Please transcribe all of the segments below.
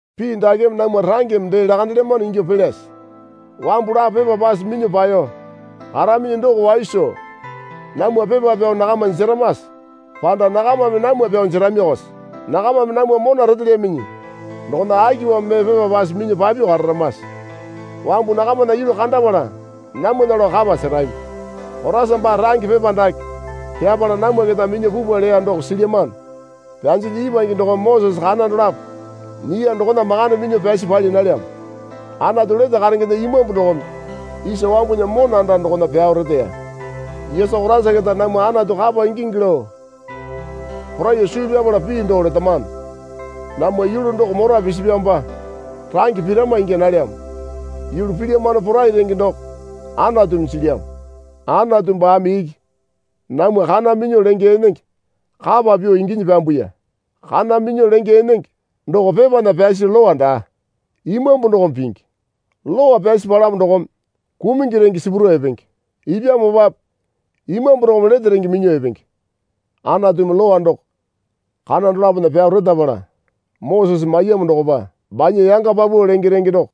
Pii dakeme namwa rangeme dee lakandelyamano ingyuo pelyase? Wambu lapo pepa pase minyuo paeyo karaminyi doko wai soo namwa pepa pyao nakama jeramase? Panda nakamame namwa pyao jeramiyokose? Nakamame namwa mona retelyaminyi dokona akipamo mee pepa pase minyuo papyuo kararamase? Wambu nakamana yulu kandapala namwana lao kapa serami. Koraisa baa range pepa dake pyapala namwa keta minyuo pupwa leya doko silyamano. Pyanjilyi ipwange dokome Mosese kana dolapo nyiya dokona makande minyuo pyasi pali nalyamo. Anatu lete karengena Imambu dokome isa wambunya mona anda dokona pyao reteya. Yesu Koraisa keta namwa Anatu kapa ingingi lao poraiyuo suu pyapala pii doo letamano. Namwa yulu doko mora pisipyamopa range pirama ingya nalyamo. Yulu pilyamano porai renge doko Anatumi jilyamo. Anatu baame iki namwa kana minyuo lenge enenge kapa pyuo inginyi pyambuya. Kana minyuo lenge enenge doko pepana pyasi lowa daa. Imambu dokome pingi. Lowa pyasi palamo dokome kumungi renge sipuro epenge. Ipyamopape Imambu dokome lete renge minyuo epenge. Anatumi Lowa doko kana dolapona pyao retapala Mosese maiyamo dokopa banya yanga paupau lenge renge doko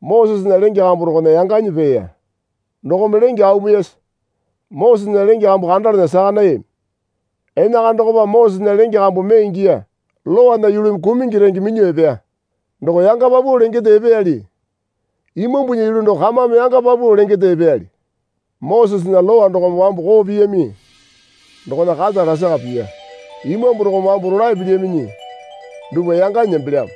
Mosesena lenge kambu dokona yanganyi peeya. Dokome lenge aumiyasa Mosesena lenge kambu kandalana saka nayami. Enakana dokopa Mosesena lenge kambu mee ingiya. Lowana yulumi kumungi renge minyuo epeya doko yanga paupau lengende epeyali Imambunya yulu doko kamame yanga paupau lengende epeyali. Mosesena Lowa dokome wambu koo piyami dokona kata lasaka piya. Imambu dokome wambu rolae pilyaminyi dupwa yanganyi nembelyamo.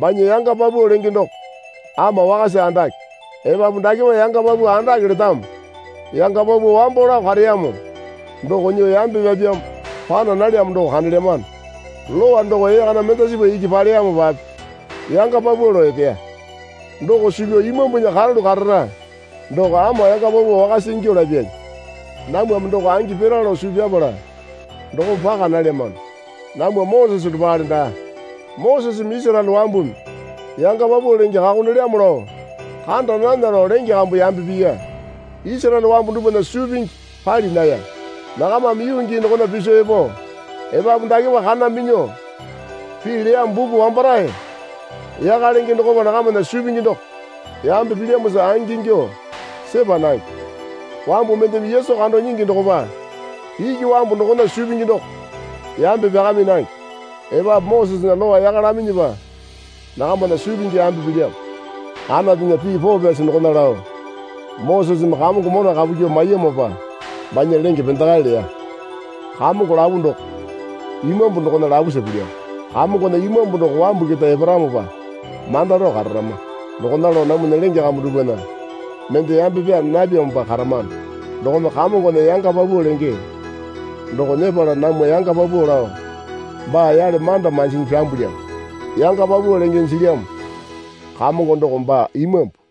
Banya yanga paupau lenge doko ama wakasa andake. Epapu dakepa yanga paupau andake letamo yanga paupau wambo lao kareyamo doko nyuo yambe pyapyamo pana nalyamo doko kandelyamano. Lowa doko ee kana mendasipa iki paleyamopape yanga paupau lao epeya. Doko suu pyao Imambunya karalu karara doko ama yanga paupau wakasa ingyuo lapyali. Namwame doko angi pira lao suu pyapala dokome paka nalyamano. Namwa Mosese dopale daa. Moseseme Isaraele wambumi yanga paupau lenge kakondelyamo lao kanda nana lao lenge kambu yambe piya. Isaraele wambu dupwana suu pingi pali naya. Nakamame yuu gii dokona piso epo epapu dakepa kana minyuo pii leyamo buku wambarae yaka lenge dokopa nakamana suu pingi doko yambe pilyamosa angingyuo sepa nange. Wambu mendeme Yesu kando nyingi dokopa iki wambu dokona suu pingi doko yambe pyakami nange. Epapu Mosesena Lowa yaka laminyipa nakamana suu pingi yambe pilyamo. Anatunya pii poo pyasi dokona lao, Moseseme Kamongo mona kapu kyuo maiyamopa banya lenge pendakae leya. Kamongo lapu doko Imambu dokona lapusa pilyamo. Kamongona Imambu doko wambu keta eparamopa manda rao kararama. Dokona lao namwana lenge kambu dupwana mende yambe pyaa napyamopa karamano dokome Kamongona yanga paupau lenge doko nyepala namwa yanga paupau lao baa yale manda manjinyi pyambulyamo. Yanga paupau lenge jilyamo Kamongo doko baa Imambu.